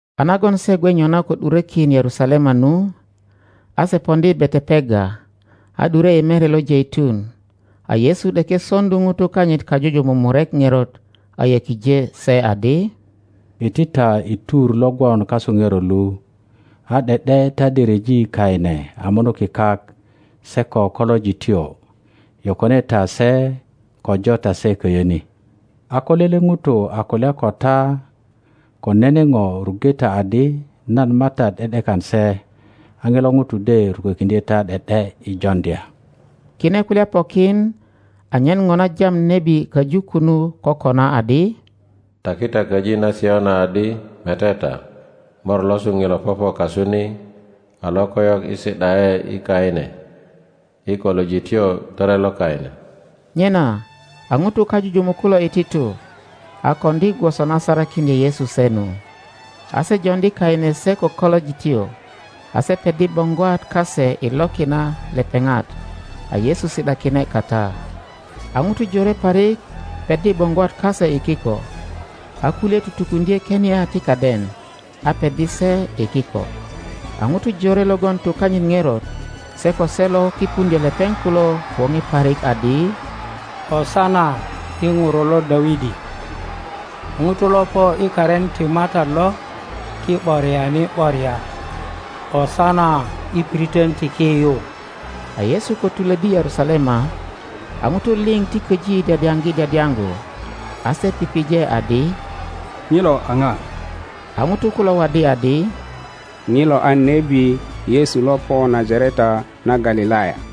A nagon se gwe nyona ko ’durökin Yerusalema nu, a se poŋdi Betepage, a ’dure i Mere lo Jeitun, a Yesu ’deke soŋdu ŋutu kanyit kajujumuk murek ŋerot, a yökije se adi, Iti ta i tur lo gwon kasu ŋerot lu, a ’de ’de ta de ryeji kaine a munuki kak, se ko kolojityo; yokone ta se ko jo ta se köyö ni. A ko lele ŋuto a kulya ko ta ko nene ŋo, ruŋge ta adi, nan MATAT ’de ’dekan se, a ŋilo ŋuto de rukökiŋdye ta ’de ’de i joŋdya. Kine kulya pokin anyen ŋo na jam nebi köju kunu kokona, adi, Taki ta köji na Siöna adi, Mete ta, Mor losu ŋilo popo kasu ni, a lokoyok i si ’da ’e i kaine, i kolojityo tore lo kaine. Nyena a ŋutu kajujumuk kulo iti tu, a koŋdi gwoso na sarakiŋdye Yesu se nu. A se joŋdi kaine se ko kolojityo, a se peddi boŋgwat kase i loki na lepeŋat, a Yesu si ’dakine kata. A ŋutu jore parik peddi boŋgwat kase i kiko, a kulye tutukuŋdye kenia ti kaden, a peddi se i kiko. A ŋutu jore logon tu kanyit ŋerot, se ko se lo kipuŋdyö lepeŋ kulo woŋe parik adi, ösana i Ŋuro lo Dawidi! Ŋuto lo po i karin ti MATAT lo, ti ’boriani ’boria! ösana i piritön ti ki yu! A Yesu ko tulöddi Yerusalema, a ŋutu liŋ ti köji dyadyaŋgi dyadyaŋgu. A se pije adi, Ŋilö a ŋa? A ŋutu kulo waddi adi, Ŋilo a nebi Yesu lo po Najareta na Galilaya.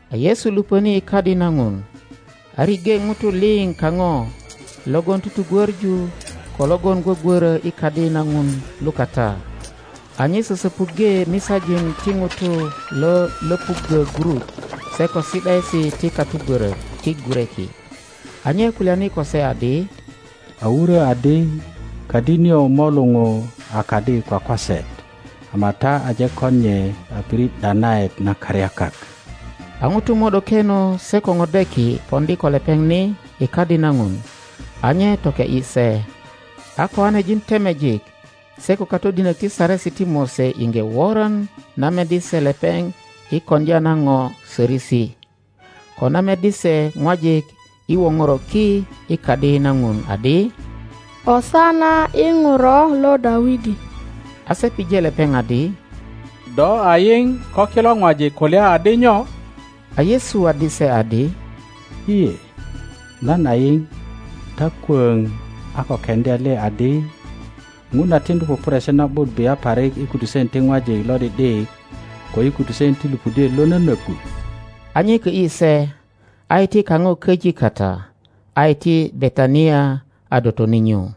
A Yesu lupöni i Kadi na Ŋun, a riŋge ŋutu liŋ kaŋo logon tugwöŋu ko logon gwögwörö i Kadi na Ŋun lukata; a nye sösöpuŋge misajin ti ŋutu lo löpuggö gurut se ko si ’daesi ti katugwörök ti gureki. a nye kulyani ko se adi, A wurö adi, Kadi nio mo luŋu a kadi kwakwaset; ama ta aje kon nye a pirit ’danaet na karyakak. A ŋutu mo ’dokeno se ko ŋodeki poŋdi ko lepeŋ ni i Kadi na Ŋun, a nye toke ’yi se. a kiŋanejin temejik se ko katodinök ti Saresi ti Mose iŋge woran na meddi se lepeŋ i koŋdya na ŋo sörösi, ko na meddi se ŋwajik i woŋoro ki i Kadi na Ŋun adi, ösana i Ŋuro lo Dawidi! A se pije lepeŋ adi, Do a yiŋ ko kilo ŋwajik kulya adi nyo? A Yesu waddi se adi, lye, nan a yiŋ; ta kwöŋ a ko keŋdya le adi, Ŋun a tiŋdu pupuresi na ’but bia parik i kutusen ti ŋwajik lo ’di ’dik ko i kutusen ti lupudiet lo nönöggu? A nye kö ’yi se, a iti kaŋo köji kata a iti Betania, a dotoni nyu.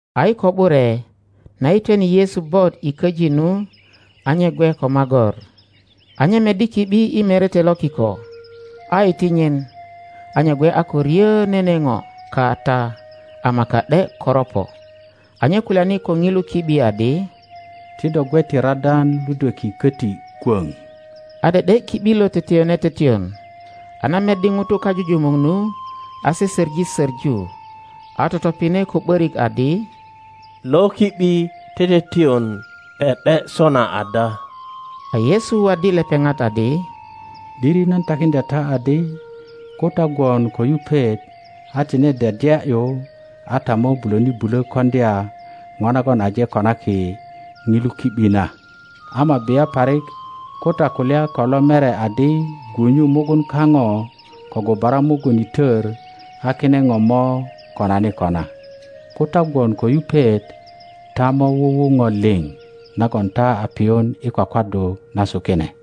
A i ko ’bure, na yitwene Yesu bot i köji nu, a nye gwe ko magor. A nye meddi ki ’bi i merete lo kiko, a iti nyin, a nye gwe a ko ryö nene ŋo kata ama ka ’de koropo. A nye kulyani ko ŋilu ki ’bi adi, Ti do gwe ti radan ludweki köti kwöŋ! A ’de ’de ki ’bi lo teteyone teteyon. a na meddi ŋutu kajujumuk nu, a se söŋi söŋu, a totopine ko ’börik adi, Lo ki ’bi teteyon ’de ’de sona ada? Kor 13.2A Yesu waddi lepeŋat adi, ’Diri nan takiŋdya ta adi ko ta gwon ko yupet a tine dyadya ’yu, a ta mo bulöni bulö koŋdya ŋo nagon aje konaki ŋilu ki ’bi na, ama bia parik ko ta kulya ko lo mere adi, Gwunyu mugun kaŋo ko gubara mugun i tör, a kine ŋo mo konani kona. Ko ta gwon ko yupet ta mo wuwu ŋo liŋ nagon ta a piyun i kwakwaddu nasu kine.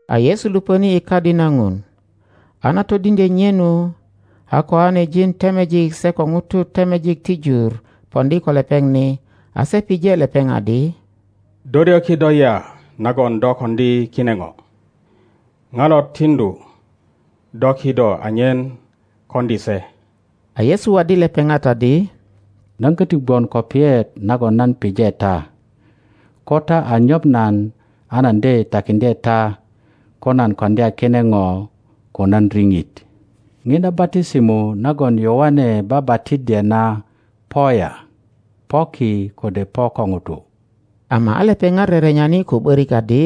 A Yesu lupöni i Kadi na Ŋun, a na todiŋdye nye nu, a koanejin temejik se ko ŋutu temejik ti jur poŋdi ko lepeŋ ni, a se pije lepeŋ adi, Do ryö kido ya nagon do koŋdi kine ŋo? Ŋa lo tiŋdu do kido anyen koŋdi se? a Yesu waddi lepeŋat adi, Nan köti gwon ko piyet nagon nan pije ta; ko ta a nyoŋ nan, a nan de takiŋdye ta ko nan koŋdya kine ŋo ko nan riŋit. Ŋiŋa batisimo nagon Yoane babatiddye na po ya? Po ki kode po ko ŋutu? Ama a lepeŋat rerenyani ko ’börik adi,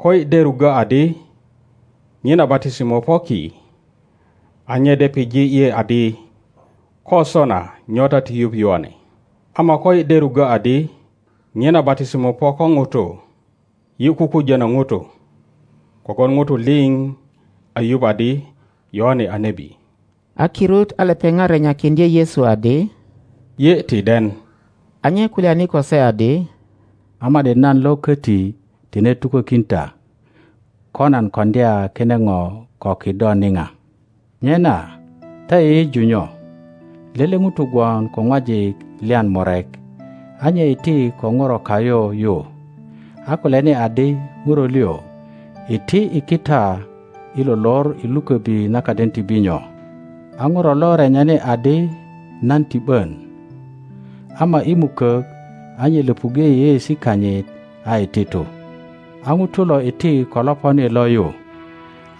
Koyi de ruggö adi, Ŋina batisimo po ki, a nye de pije yi adi, Ko sona, nyo ta ti yuŋ Yoane? Ama koyi de ruggö adi, Ŋina batisimö po ko ŋutu, yi kukujönö ŋutu, kogwon ŋutu liŋ a yuŋ adi Yoane a nebi. A kirut a lepeŋat renyakiŋdye Yesu adi, Yi ti den. A nye kulyani ko se adi, A ma ’di nan lo köti tine tukökin ta kö nan köŋdya kine ŋö ko kido niŋa. Nyena ta yeyeju nyo? Lele ŋuto gwon ko ŋwajik lyan murek. A nye iti ko ŋuro kayu yu, a kulyani adi, Ŋuro liŋ, iti i kita i lo lor i luköbi na kaden ti binyo. a ŋuro lo renyani adi, Nan ti ’bön. Ama i mukök a nye löpuŋge yeyeesi kanyit, a iti tu. a ŋuto lo iti ko loponi lo yu,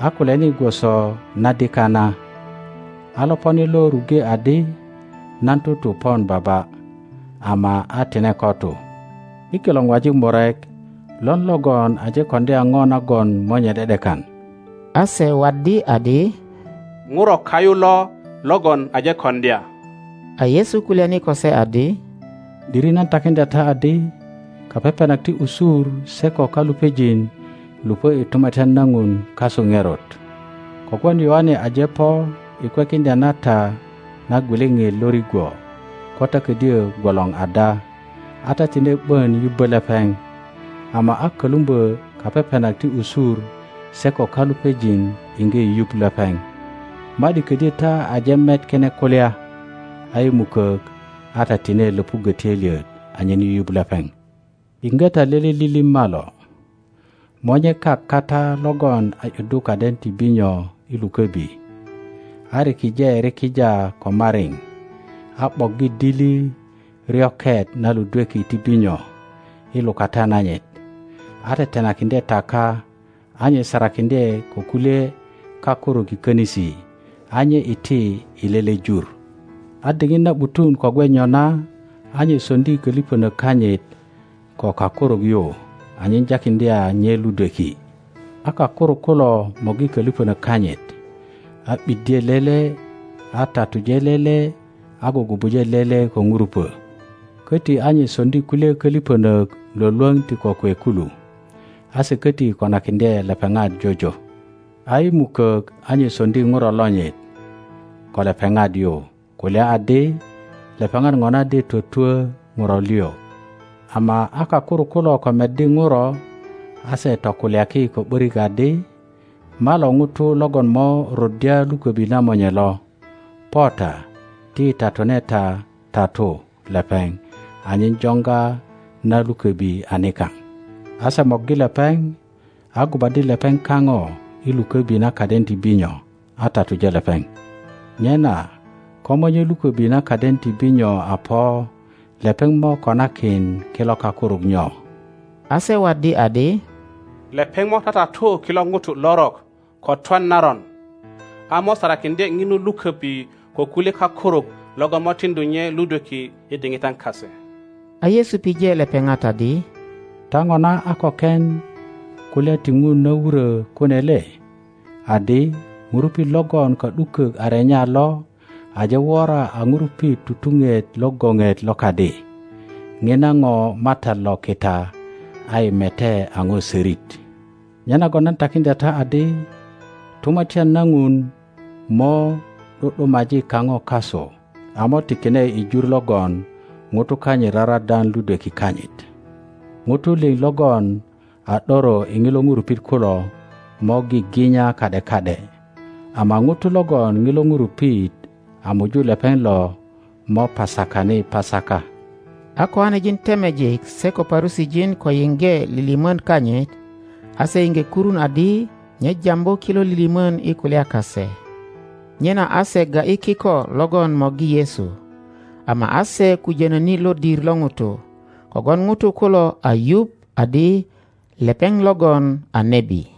a kulyani gwoso na dika na. A loponi lo ruŋge adi, Nan tutu pon baba. Ama a tine ko tu. I kilo ŋwajik murek lon logon aje koŋdya ŋo nagon monye ’de ’dekan? A se waddi adi, Ŋuro kayu lo logon aje koŋdya. A Yesu kulyani ko se adi, ’Diri nan takiŋdya ta adi, Kapepenak ti usur se ko kalupejin lupö i Tumatyan na Ŋun kasu ŋerot. Kogwon Yoane aje po i kwekiŋdya na ta na gwiliŋit lo rigwo ko ta ködyö gwolor ada, a ta tine ’bön yubbö lepeŋ; ama a kölumbö kapepenak ti usur se ko kalupejin iŋge yuŋ lepeŋ. Ma ’di ködyö ta aje met kine kulya, a i mukök a ta tine löpuggö töilyet anyen yuyuŋ lepeŋ. Yiŋge ta lele lilim malo. Monye kak kata logon a ’yuddu kaden ti binyo i luköbi, a rikije rikija ko mariŋ, a ’boggi dili ryoket na ludweki ti binyo i lukata nanyit, a tetenakiŋdye taka, a nye sarakiŋdye ko kulye kakuruk i könisi, a nye iti i lele jur. a diŋit na ’butun ko gwe nyona, a nye soŋdi kölipönök kanyit ko kakuruk yu anyen jakiŋdya nye ludweki. a kakuruk kulo morgi kölipönök kanyit, a ’biddye lele, a tatuje lele, a gugubuje lele ko ŋurupö. Köti a nye soŋdi kulye kölipönök lwölwöŋ ti kokwe kulu, a se köti konakiŋdye lepeŋat jojo. a i mukök a nye soŋdi ŋuro lonyit ko lepeŋat yu, kulya adi, Lepeŋat ŋona de twötwö ŋuro liŋ. Ama a kakuruk kulo ko meddi ŋuro, a se tokulyaki ko ’börik adi, Malo ŋuto logon mo ruddya luköbi na monye lo. Po ta, ti yi tatune ta tatu lepeŋ, anyen joŋga na luköbi a nikaŋ. A se morgi lepeŋ, a gubaddi lepeŋ kaŋo i luköbi na kaden ti binyo, a tatuje lepeŋ. Nyena ko monye luköbi na kaden ti binyo a po, lepeŋ mo konakin kilo kakuruk nyo? A se waddi adi. Lepeŋ mo tatatu kilo ŋutu lorok ko twan naron, a mo sarakiŋdye ŋinu luköbi ko kulye kakuruk logon mo tiŋdu nye ludweki i diŋitan kase. A Yesu pije lepeŋat adi, Ta ŋona a ko ken kulya ti Ŋun na wurö kune le? Adi: Ŋurupit logon ka ’dukök a renya lo aje wora a ŋurupit tutuŋet lo goŋet lo kadi. Ŋina ŋo MATAT lo kita a yi mete a ŋo sörit! Nyenagon nan takiŋdya ta adi, Tumatyan na Ŋun mo ’du ’dumaji kaŋo kasu, a mo tikine i jur logon ŋutu kanyit raradan ludweki kanyit. [ Ŋutu liŋ logon a ’doro i ŋilo ŋurupit kulo mo giginya ka ’de ka ’de, ama ŋuto logon ŋilo ŋurupit a muju lepeŋ lo mo pasakani pasaka.] A kiŋanejin temejik se ko Parusijin ko yiŋge lilimön kanyit, a se iŋge kurun adi nye jambu kilo lilimön i kulya kase. Nyena a se ga ’yi kiko logon morgi Yesu, ama a se kujönöni lodir lo ŋutu, kogwon ŋutu kulo a yuŋ adi lepeŋ logon a nebi.